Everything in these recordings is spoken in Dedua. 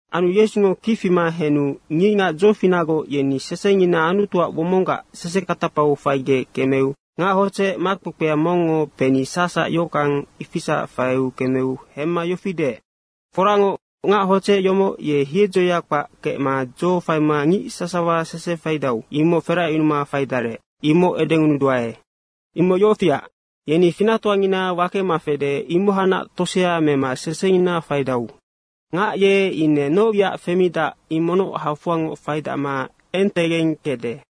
Anu Yesungo kic fima henu ngicngac dzofinacgoc yeni sesengina Anutuac womonggac sesekatapau faigec kemeu ngac hodzec makpekpea mongngo peni sacsac yohockang, ifisac faiu kemeu hemma yofi deec, “Foracngoc, ngac hodzec yomoc ye hiedzoya kpac kecma dzo faima ngic sasawa sese faidau, imoc feracyunuma faidarec, imoc edengunuduae. Imoc yofiac, yeni finactoangina wakema fede, imohacnac tosea mema sesengina faidau. Ngac ye ine noc wiac femidac imocnoc hafoangoc faidacma entegeng kecde.”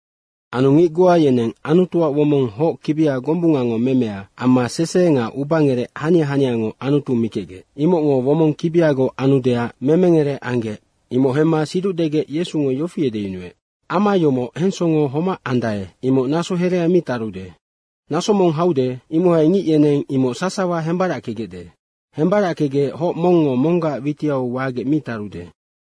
Anu ngic goa yeneng Anutuac womong hoc kibia gombungango memea amma sese nga ubangerec hania haniango Anutu mikecgec, imocngo womong kibiagoc anudeac memengere anggec, imoc hemma siduc degec Yesungo yofi edeyunuec, “Ama yomoc hensongo homac andae, imoc naso herea mi tarude. Naso mong haude, imohai ngic yeneng imoc sasawa hembarackegecde. Hembarackegec hoc mongngo monggac witiau wagec mi tarude.”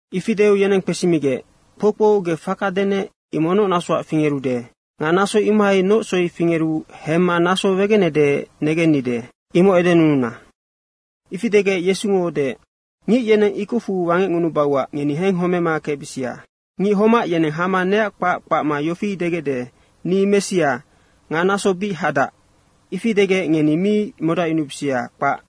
Ifi deu yeneng kpesimigec, “Kpoukpou, ge faka denec, imoc noc nasoac fingerude nga naso imohai noc soi fingeru hemma naso wegenede negennide, imoc edenununa.” Ifi degec Yesungo deec, “Ngic yeneng ikocfu wangecngunubauac ngeni henghomema kecbisia. Ngic homac yeneng hama neac kpac kpacma yofi degecde, ‘Ni Messia.’ nga ‘Naso bic hadac.’ ifi degec ngeni mi modacyunubisia, kpac.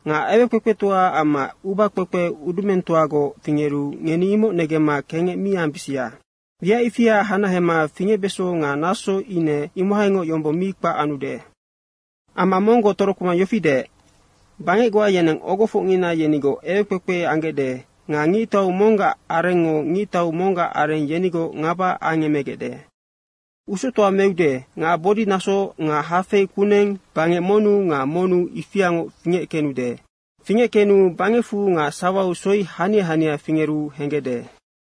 Nga ewekpekpetoa amma ubakpekpe udumengtoagoc fingeru ngeni imoc negemma kengec mi ambisia. Wiac ifia hanahema fingecbeso nga naso ine imohaingoc yombong mi kpac anude.” Amma monggoc torokpema yofi deec, “Bangec goa yeneng ogofocngina yenigoc ewekpekpe anggecde nga ngictau monggac arengngo ngictau monggac areng yenigoc ngaba angemegecde. Usoctoa meude nga bodinaso nga hafei kuneng bangec monnu nga monnu ifiangoc fingeckenude. Fingeckenu bangecfu nga sawau soi hania hania fingeru henggecde.”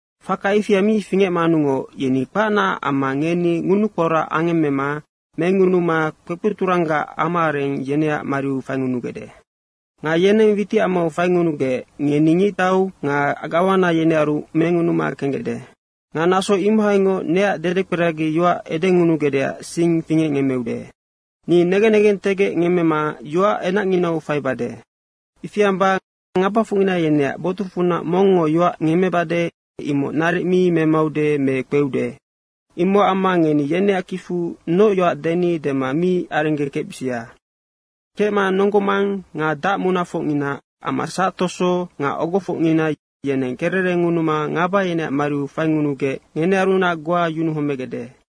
“Faka ifia mi fingecmanungoc yeni kpacnaac amma ngeni ngunukporac angemmema mengunuma kpekpeturanggac amaareng yeneac mariu faingunugecde. Nga yeneng witicamau faingunugec ngeni ngictau nga gawana yenearu mengunuma kenggecde. Nga naso imohainoc neac dedekperagi yoac edeyunugecdeac sing fingecngemmeude. Ni negen negentegec ngemmema yoac enacnginau faibade. Ifi amba ngabafocngina yeneac botucfunac mongngo yoac ngemmebade, imoc naric mi memaude me kpeude. Imocac amma ngeni yeneac kicfu noc yoac deni dema mi arenggekecbisia. Kecma nonggo mang nga dacmunafocngina amma sactoso nga ogofocngina yeneng kererengunuma ngaba yeneac mariu faingunugec ngenearunac goa yunuhomegecde.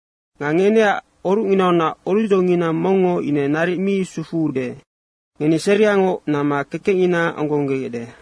Nga ngeneac orucnginaunac orucdzongina mongngo ine naric mi sufuude. Ngeni seriangoc namma kekecngina onggonggegecde.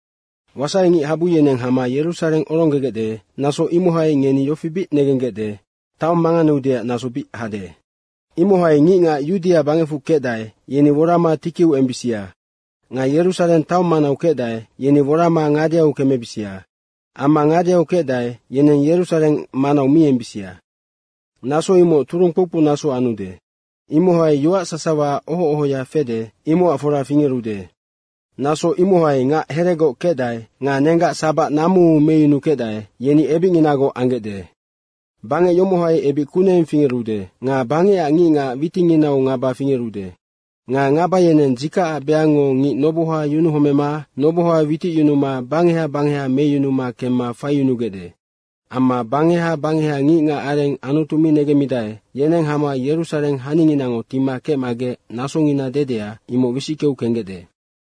Wasaingic habu yeneng hama Yerusareng oronggegecde, naso imohai ngeni yofi bic negenggecde, taong manganeudeac naso bic hade. Imohai ngicngac Yudia bangecfu kecdae, yeni worama tikiu embisia nga Yerusareng taong manau kecdae, yeni worama ngadeau kemebisia amma ngadeau kecdae, yeneng Yerusareng manau mi embisia. Naso imoc turung kpoukpou naso anude. Imohai yoac sasawa oho ohoya fede, imocac fora fingerude. Naso imohai ngac heregoc kecdae nga nenggac sabac namuu meyunukecdae, yeni ebicnginagoc anggecde. Bangec yomohai ebic kuneng fingerude nga bangecac ngicngac witinginau ngaba fingerude. Nga ngaba yeneng dzikacac beangngo ngic noboha yunuhomema noboha witicyunuma bangeha bangeha meyunuma kemma faiyunugecde. Amma bangeha bangeha ngicngac areng Anutu mi negemmidae, yeneng hama Yerusareng haninginango tima kecmagec nasongina dedea, imoc wisickeu kenggecde.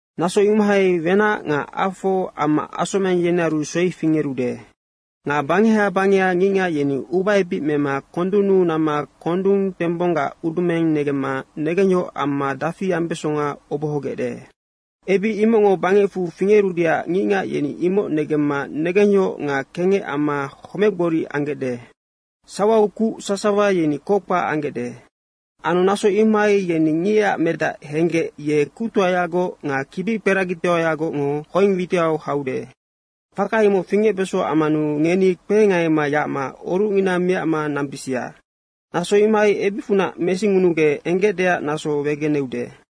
Naso imohai wenac nga afo amma asomeng yenearu soi fingerude. Nga bangeha bangeha ngicngac yeni ubaebic mema kondunnu namma kondung tembonggac udumeng negemma negengyohoc amma dafi ambesonga obohogecde. Ebic imocngo bangecfu fingerudeac ngicngac yeni imoc negemma negengyohoc nga kengec amma homecgboric anggecde. Sawau kuc sasawa yeni kockpac anggecde. Anu naso imohai yeni Ngicac Medac henggec ye kuctoayagoc nga kibikperagitoayagocngo hoeng witiau haude. Faka imoc fingecbeso ammanu ngeni kpehengaima yacma orucngina miacma nambisia. Naso imohai ebicfunac mesingunugec enggecdeac naso wegeneude.”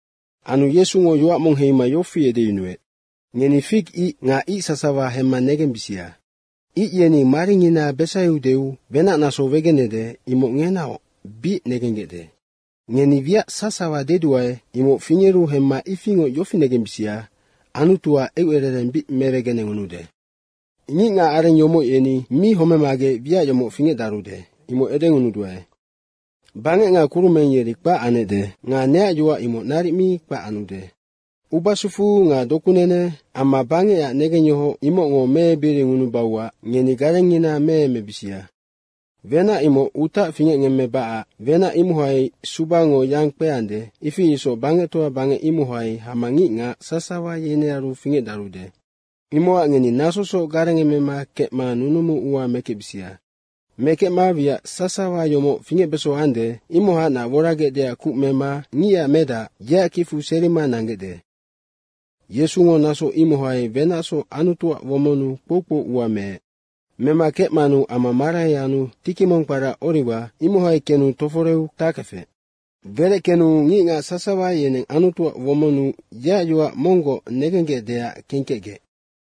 Anu Yesungo yoac mong heima yofi edeyunuec, “Ngeni fig ic nga ic sasawa hemma negembisia. Ic yeni maringina besaiudeu wenac naso wegenede, imoc ngenaoc bic negenggecde. Ngeni wiac sasawa deduae, imoc fingeru hemma ifingoc yofi negembisia, Anutuac eucerereng bic mewegenengunude. Foracngoc, ngicngac areng yomoc, yeni mi homemagec wiac yomoc fingecdarude, imoc edengunuduae. Bangec nga kurumeng, yeri kpac anecde nga neac yoac imoc naric mi kpac anude. Ubasufu nga dokunene amma bangecac negengyohoc imocngo meebiringunubauac ngeni garengngina meemebisia. Wenac imoc utac fingecngemmebacac. Wenac imohai subango yang kpeande, ifi isoc bangectoa bangec imohai hama ngicngac sasawa yenearu fingecdarude. Imocac ngeni nasosoc garengemema kecma nunumu ua mekecbisia. Mekecma wiac sasawa yomoc fingecbeso ande, imohacnac woragecdeac kuc mema Ngicac Medac, yeac kicfu serima nanggecde.” Yesungo naso imohai wenacsoc Anutuac womonnu kpoukpou ua meec. Mema kecmanu ama marai anu tiki mong kpara Oriwa, imohai kenu toforeu takefec. Wereckenu ngicngac sasawa yeneng Anutuac womonnu yeac yoac monggoc negenggecdeac kengkecgec.